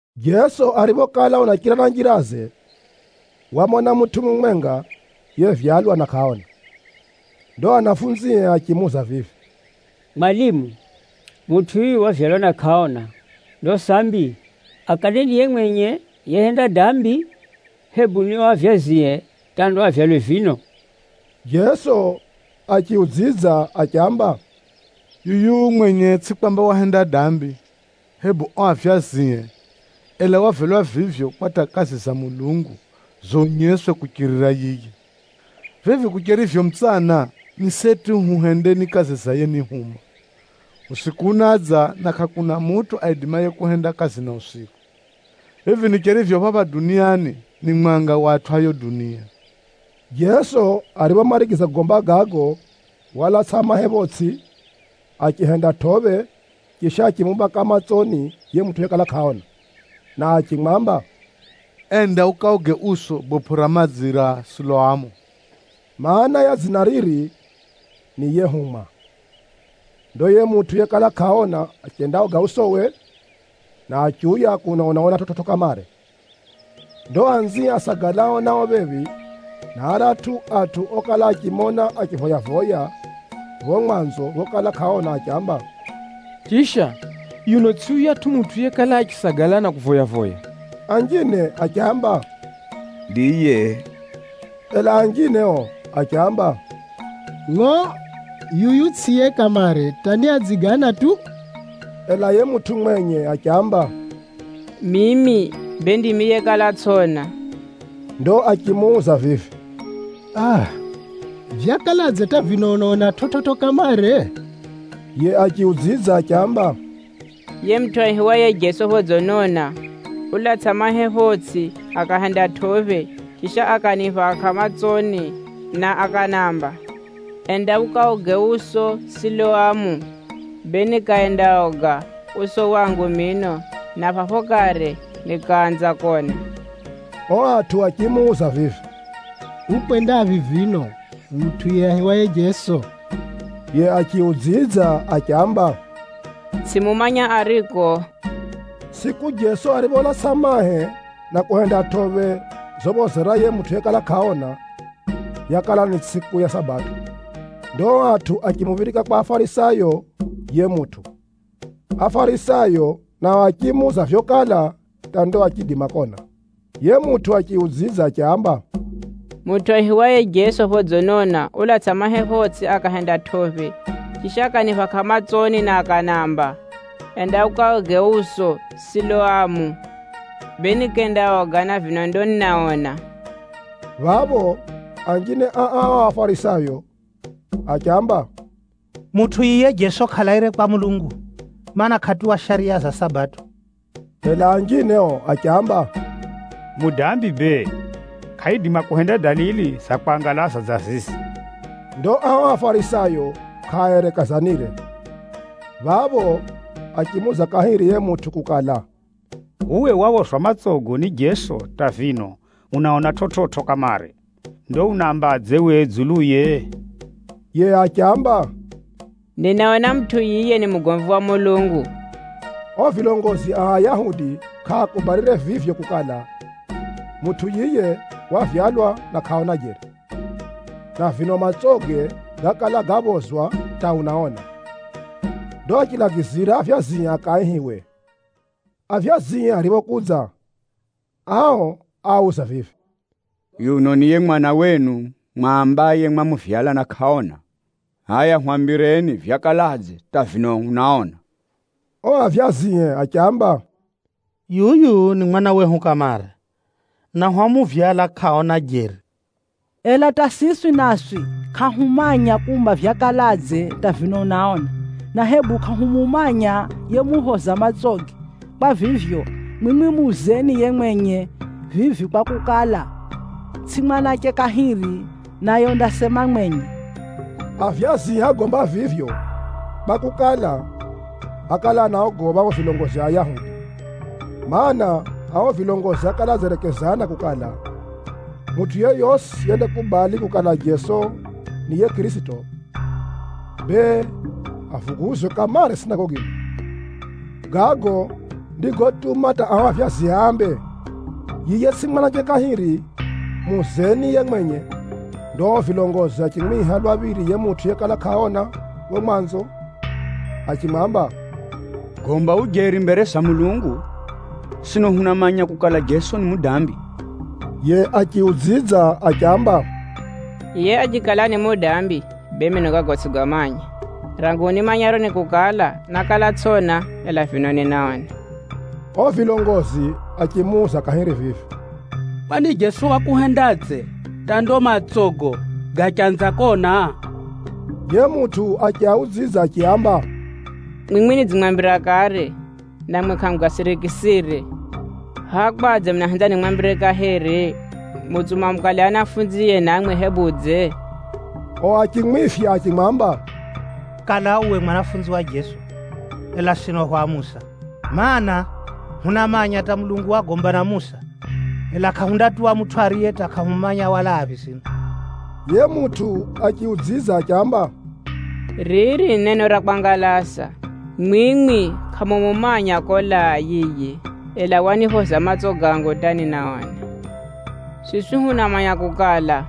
Jeso ariphokala unachira na njiraze, wamona mutʼu mumwenga yevyalwa na kʼaona. Ndo anafunzie achimuuza vivi, “Mwalimu, mutʼu yuyu wavyalwa na kʼaona. Ndo sambi, akale ni yiye mwenye yehenda dambi, hebu ni o avyazie hata ndo avyalwe vino?” Jeso achiudzidza achiamba, “Yuyu mwenye tsʼi kwamba wahenda dambi, hebu o avyazie, ela wavyalwa vivyo, kwa hata kazi za Mulungu zonyeswe kuchirira yiye. Vivi kucherivyo mutsana, ni seti huhendeni kazi za yenihuma. Usiku unadza, na kʼakuna mutʼu aidimaye kuhenda kazi na usiku. Vivi nicherivyo phapha duniani, ni mwanga wa atʼu a yo dunia.” Jeso ariphomarigiza kugomba gago, walatsʼa mahe photsʼi, achihenda tʼophe chisha achimuphaka matsoni yiye mutʼu yekala kʼaona, na achimwamba, “Enda ukaoge uso bopʼo ra madzi ra Siloamu.” (Maana ya dzina riri ni “Yehumwa”). Ndo yiye mutʼu yekala kʼaona achendaoga usowe, na achiuya kuno unaona chividzo kamare. Ndo anzie asagalao nao phephi, na aratʼu atʼu okala achimona achivoya-voya pho mwanzo phokala kʼaona achiamba, “Chisha, yuno tsʼi yuyatʼu mutʼu yekala achisagala na kuvoya-voya?” Anjine achiamba, “Ndiye!” Ela anjine o achiamba, “Ngʼo, yuyu tsʼiye kamare hata ni adziigana tu.” Ela yiye mutʼu mwenye achiamba, “Mimi bee ndimi yekala tsʼona!” Ndo achimuuza vivi, “Aa! Vyakaladze hata vino unaona chividzo kamare?” Yiye achiudzidza achiamba, “Yiye mutʼu aihiwaye Jeso phodzinona, ulatsʼa mahe photsʼi akahenda tʼophe, chisha akaniphaka matsoni na akanamba, ‘Enda ukaoge uso Siloamu.’ Bee nikendaoga uso wangu mino, na phapho kare nikaanza kona.” O atʼu achimuuza vivi, “Ukwendaphi vino mutʼu yiye aihiwaye Jeso?” Yiye achiudzidza achiamba, “Tsʼimumanya ariko.” Tsʼiku Jeso aripholatsʼa mahe na kuhenda tʼophe zophozera yiye mutʼu yekala kʼaona, yakala ni tsʼiku ya Sabato. Ndo o atʼu achimuphirika kwa Afarisayo yiye mutʼu. Afarisayo nao achimuuza vyokala hata ndo achiidima kona. Yiye mutʼu achiaudzidza achiaamba, “Mutʼu aihiwaye Jeso phodzinona, ulatsʼa mahe photsʼi akahenda tʼophe, chisha akaniphaka matsoni na akanamba, ‘Enda ukaoge uso Siloamu.’ Bee nikendaoga, na vino ndo ninaona.” Phapho anjine a ao Afarisayo achiamba, “Mutʼu yiye Jeso kʼalaire kwa Mulungu, mana, kʼatuwa shariya za Sabato.” Ela anjine o achiamba, “Mudambi bee, kʼaidima kuhenda dalili za kwangalaza dza zizi.” Ndo ao Afarisayo kʼaaerekezanire. Phapho achimuuza kahiri yiye mutʼu kukala, “Uwe waphozwa matsogo ni Jeso hata vino unaona chividzo kamare. Ndo unaambadze we dzuluye?” Yiye achiamba, “Ninaona mutʼu yiye ni mugomvi wa Mulungu!” O vilongozi a Ayahudi kʼaakubalire vivyo kukala, mutʼu yiye wavyalwa na kʼaona jeri, na vino matsoge gákala gaphozwa hata unaona. Ndo achilagizira avyazie akaihiwe. Avyazie ariphokudza, ao áauza vivi, “Yuno ni yiye mwana wenu mwambaye mwamuvyala na kʼaona? Hʼaya hwambireni vyakaladze hata vino unaona?” O avyazie achiamba, “Yuyu ni mwana wehu kamare, na hwamuvyala kʼaona jeri. Ela hata siswi naswi kʼahumanya kumba vyakaladze hata vino unaona, na hebu kʼahumumanya yemuphoza matsoge. Kwa vivyo, mwimwi muuzeni yiye mwenye vivi kwakukala, tsʼi mwanache kahiri, naye undasema mwenye.” Avyazie ágomba vivyo kwakukala, ákala anaogopha o vilongozi a Ayahudi. Maana, ao vilongozi ákala adzerekezana kukala, mutʼu yeyosi yendakubali kukala Jeso ni yiye Kʼirisito, bee avuguzwe kamare sinagogini. Gago ndigotuma hata ao avyazie ambe, “Yiye tsʼi mwanache kahiri, muuzeni yiye mwenye.” Ndo o vilongozi achimwiha lwa phiri yiye mutʼu yekala kʼaona pho mwanzo achimwamba, “Gomba ujeri mbere za Mulungu! Sino hunamanya kukala, Jeso ni mudambi.” Yiye achiudzidza achiamba, “Yiye achikala ni mudambi, bee mino gago tsʼigamanya. Rangu nimanyaro ni kukala, nákala tsʼona, ela vino ninaona.” O vilongozi achimuuza kahiri vivi, “Kwani Jeso wakuhendadze hata ndo matsogo gachanza kona?” Yiye mutʼu achiaudzidza achiaamba, “Mwimwi nidzimwambira kare, namwi kʼamugasirikisire. Hʼa kwadze munahenza nimwambire kahiri? Mutsuma mukale anafunzie namwi hebudze?” O achimwifya achimwamba, “Kala uwe mwanafunzi wa Jeso, ela sino hwa Musa. Maana, hunamanya hata Mulungu wagomba na Musa. Ela kʼahundatuwa mutʼu ariye hata kʼahumumanya walaaphi sino!” Yiye mutʼu achiudzidza achiamba, “Riri ni neno ra kwangalaza! Mwimwi kʼamumumanya kolaa yiye, ela waniphoza matso gangu hata ninaona. Siswi hunamanya kukala,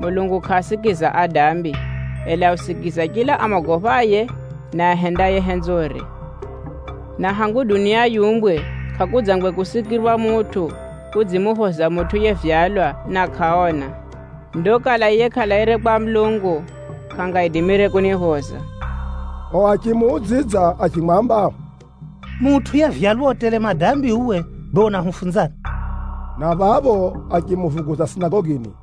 Mulungu kʼaasikiza adambi, ela usikiza chila amogophaye, na ahendaye henzore. Na hangu dunia yiumbwe, kʼakudzangwe kusikirwa mutʼu udzimuphoza mutʼu yevyalwa na kʼaona. Ndo kala yiye kʼalaire kwa Mulungu, kʼangaidimire kuniphoza.” O achimuudzidza achimwamba, “Mutʼu yevyalwa u tele madambi uwe, bee unahufunzani?” Na phapho achimuvuguza sinagogini.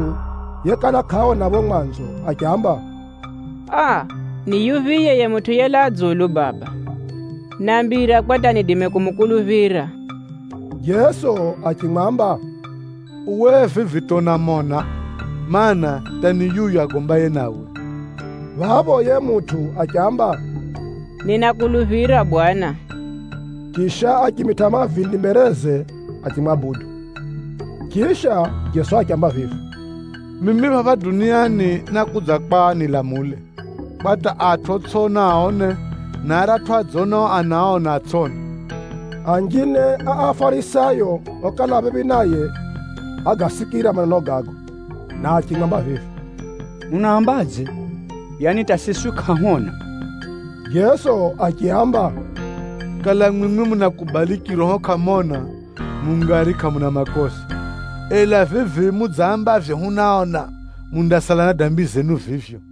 Yiye mutʼu yekala kʼaona pho mwanzo achiamba, “Aa! Ni yuphiye Bwana ye Mutʼu yelaa dzulu kwa hata niidime kumukuluphira?” Jeso achimwamba, “Uwe vivi hata unamona, mana, hata ni yuyu agombaye nawe.” Phapho yiye mutʼu achiamba, “Ninakuluphira Bwana!” Chisha, achimitʼa mavindi mbereze achimwabudu. Chisha Jeso achiamba vivi, “Mimi phapha duniani nákudza kwa nilamule, kwa hata atʼu otsʼiona aone, na aratʼu adzonao anaona, atsʼone.” Anjine a Afarisayo okala a phephi naye ágasikira maneno gago na achimwamba vivi, “Unaambadze? Yaani hata siswi kʼahwona?” Jeso achiaamba, “Kala mwimwi munakubali chiroho kʼamona, mungari kʼamuna makosa. Ela vivi mudzambavyo, ‘Hunaona,’ mundasala na dambi zenu vivyo.”